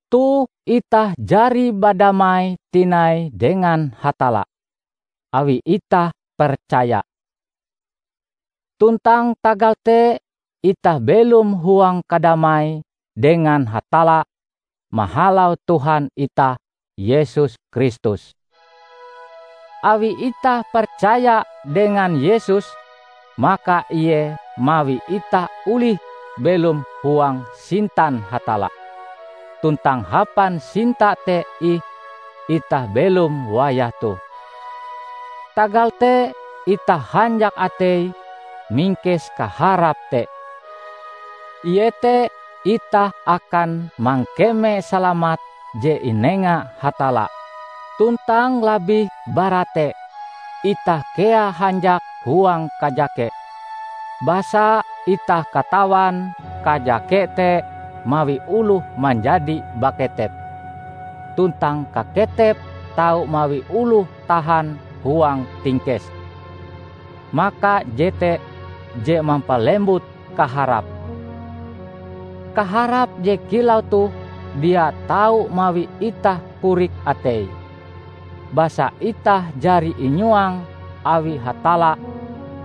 Toh itah jari badamai tinai dengan Hatalla, awi itah percaya. Tuntang tagal te itah belom huang kadamai dengan Hatalla mahalau Tuhan itah Yesus Kristus. Awi itah percaya dengan Yesus, maka Ie mawi itah olih belom huang sintan Hatalla, tuntang hapan sinta te ih itah belom wayah toh. Tagal te itah hanjak atei mingkes kaharap te, iete itah akan mangkeme salamat je inenga Hatalla! Tuntang labih bara te, itah kea hanjak huang kajake, basa itah katawan kajake te mawi oloh manjadi baketep, tuntang kaketep tau mawi oloh tahan huang tingkes; maka jete je mampalembut kaharap. Kaharap je kilau toh dia tau mawi itah korik atei, basa itah jari inyuang awi Hatalla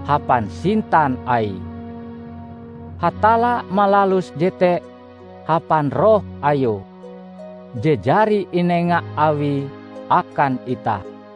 hapan sintan Aie. Hatalla malalus jete hapan Roh Ayue, je jari inenga Awie akan itah.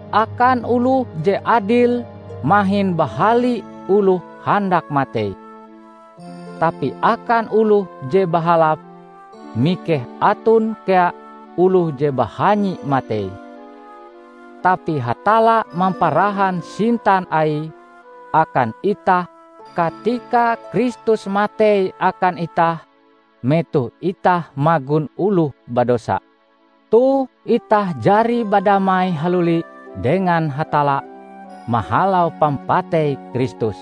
Akan oloh je adil mahin bahali oloh handak matei. Tapi akan oloh je bahalap, mikeh aton kea oloh je bahanyi matei. Tapi Hatalla mamparahan sintan Aie akan itah katika Kristus matei akan itah metoh itah magon oloh badosa. Toh itah jari badamai haluli dengan Hatalla mahalau pampatei Kristus;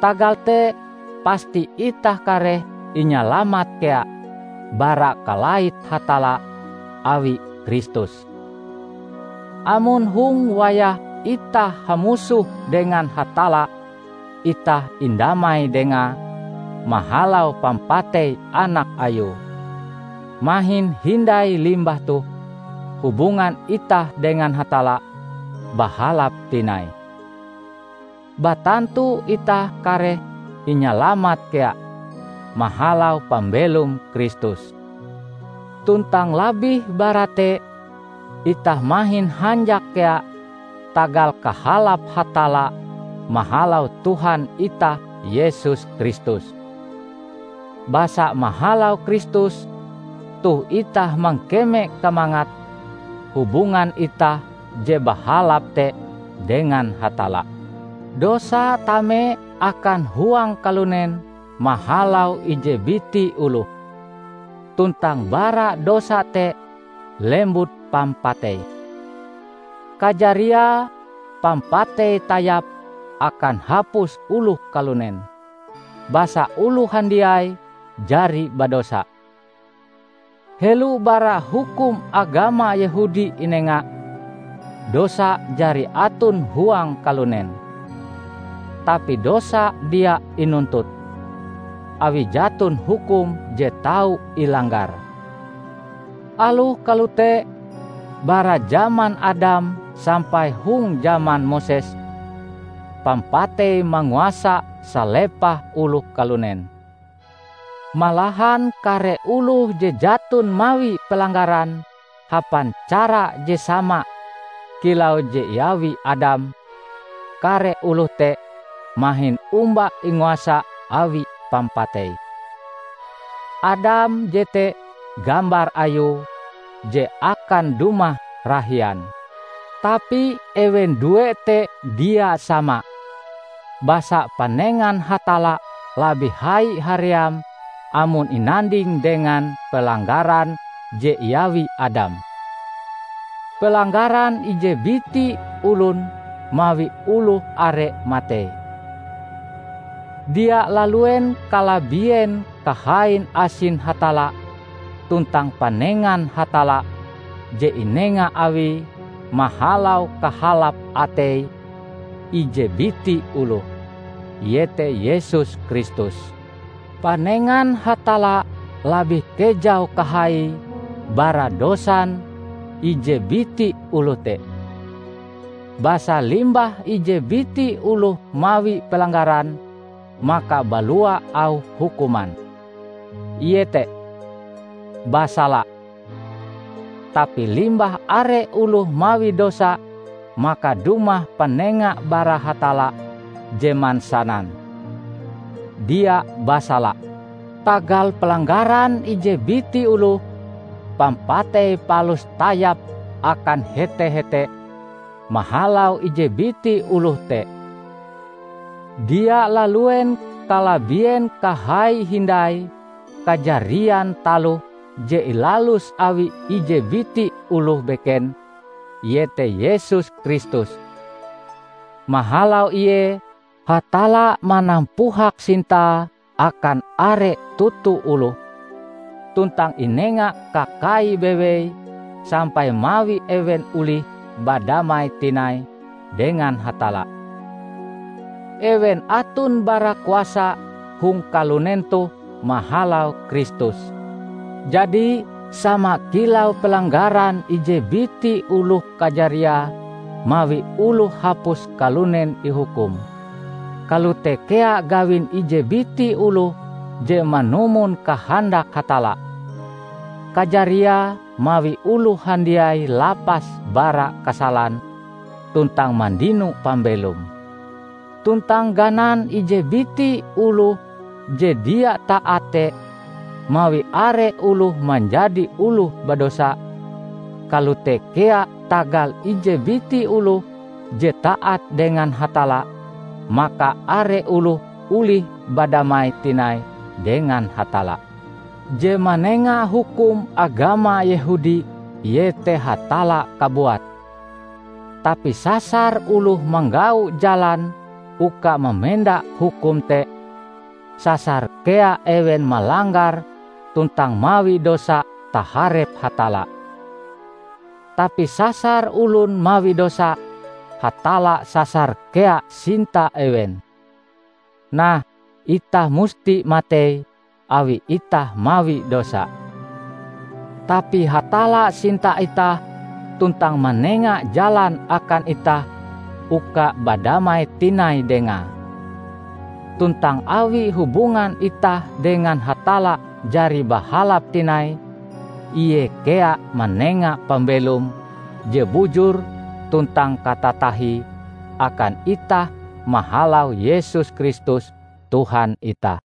tagal te pasti itah kareh inyalamat kea bara kalait Hatalla awi Kristus. Amon hong wayah itah hamusoh dengan Hatalla itah indamai Dengae mahalau pampatei Anak Ayue, mahin hindai limbah toh hubungan itah dengan Hatalla bahalap tinai, batantu itah kareh inyalamat kea mahalau pambelom Kristus. Tuntang labih bara te, itah mahin hanjak kea tagal kahalap Hatalla mahalau Tuhan itah Yesus Kristus. Basa mahalau Kristus, toh itah mangkeme kamangat hubungan itah je bahalap te dengan Hatalla. Dosa tame akan huang kalunen mahalau ije biti oloh, tuntang bara dosa te lembut pampatei. Kajariae, pampatei tayap akan hapus oloh kalunen, basa oloh handiai jari badosa. Helo bara hukum agama Yehudi inenga, dosa jari aton huang kalunen. Tapi dosa dia inuntut, awi jaton hukum je tau ilanggar. Aloh kalote, bara jaman Adam sampai hong jaman Moses, pampatei manguasa salepah oloh kalunen. Malahan kare oloh je jaton mawi pelanggaran hapan cara je sama kilau je iawi Adam, kare oloh te mahin omba inguasa awi pampatei. Adam jete gambar Ayue je akan dumah rahian. Tapi ewen due te dia sama; basa panengan Hatalla labih hai haream amon inanding dengan pelanggaran je iawi Adam. Pelanggaran ije biti olon mawi oloh are matei. Dia laluen kalabien kahain asin Hatalla tuntang panengan Hatalla je inenga Awie mahalau kahalap atei ije biti oloh, iete Yesus Kristus. Panengan Hatalla labih kejau kahaie bara dosan ije biti oloh te. Basa limbah ije biti oloh mawi pelanggaran, maka balua auh hukuman, iete "basala". Tapi limbah are oloh mawi dosa maka dumah panenga bara Hatalla je mansanan, "dia basala". Tagal pelanggaran ije biti oloh, pampatei palus tayap akan hete-hete mahalau ije biti oloh te. Dia laluen kalabien kahaie hindai kajarian taloh je ilalus awi ije biti oloh beken, iete Yesus Kristus. Mahalau Ie, Hatalla manampuhak sintae akan are toto oloh tuntang inenga kakai bewei sampai mawi ewen olih badamai tinai dengan Hatalla; ewen aton barakuasa hong kalunen toh mahalau Kristus. Jadi, sama kilau pelanggaran ije biti oloh kajariae mawi oloh hapus kalunen ihukum, kalote kea gawin ije biti oloh je manumon kahandak Hatalla, kajariae mawi oloh handiai lapas bara kasalan tuntang mandino pambelom. Tuntang ganan ije biti oloh je dia taat te mawi are oloh manjadi oloh badosa, kalote kea tagal ije biti oloh je taat dengan Hatalla maka are oloh olih badamai tinai dengan Hatalla. Je manenga hukum agama Yehudi iete Hatalla kabuat. Tapi sasar oloh manggau jalan uka mamenda hukum te, sasar kea ewen malanggar tuntang mawi dosa taharep Hatalla. Tapi sasar olon mawi dosa, Hatalla sasar kea sinta ewen. Nah, itah musti matei awi itah mawi dosa. Tapi Hatalla sinta itah tuntang manenga jalan akan itah uka badamai tinai Dengae. Tuntang awi hubungan itah dengan Hatalla jari bahalap tinai, Ie kea manenga pambelom je bujur tuntang katatahie akan itah mahalau Yesus Kristus Tuhan itah.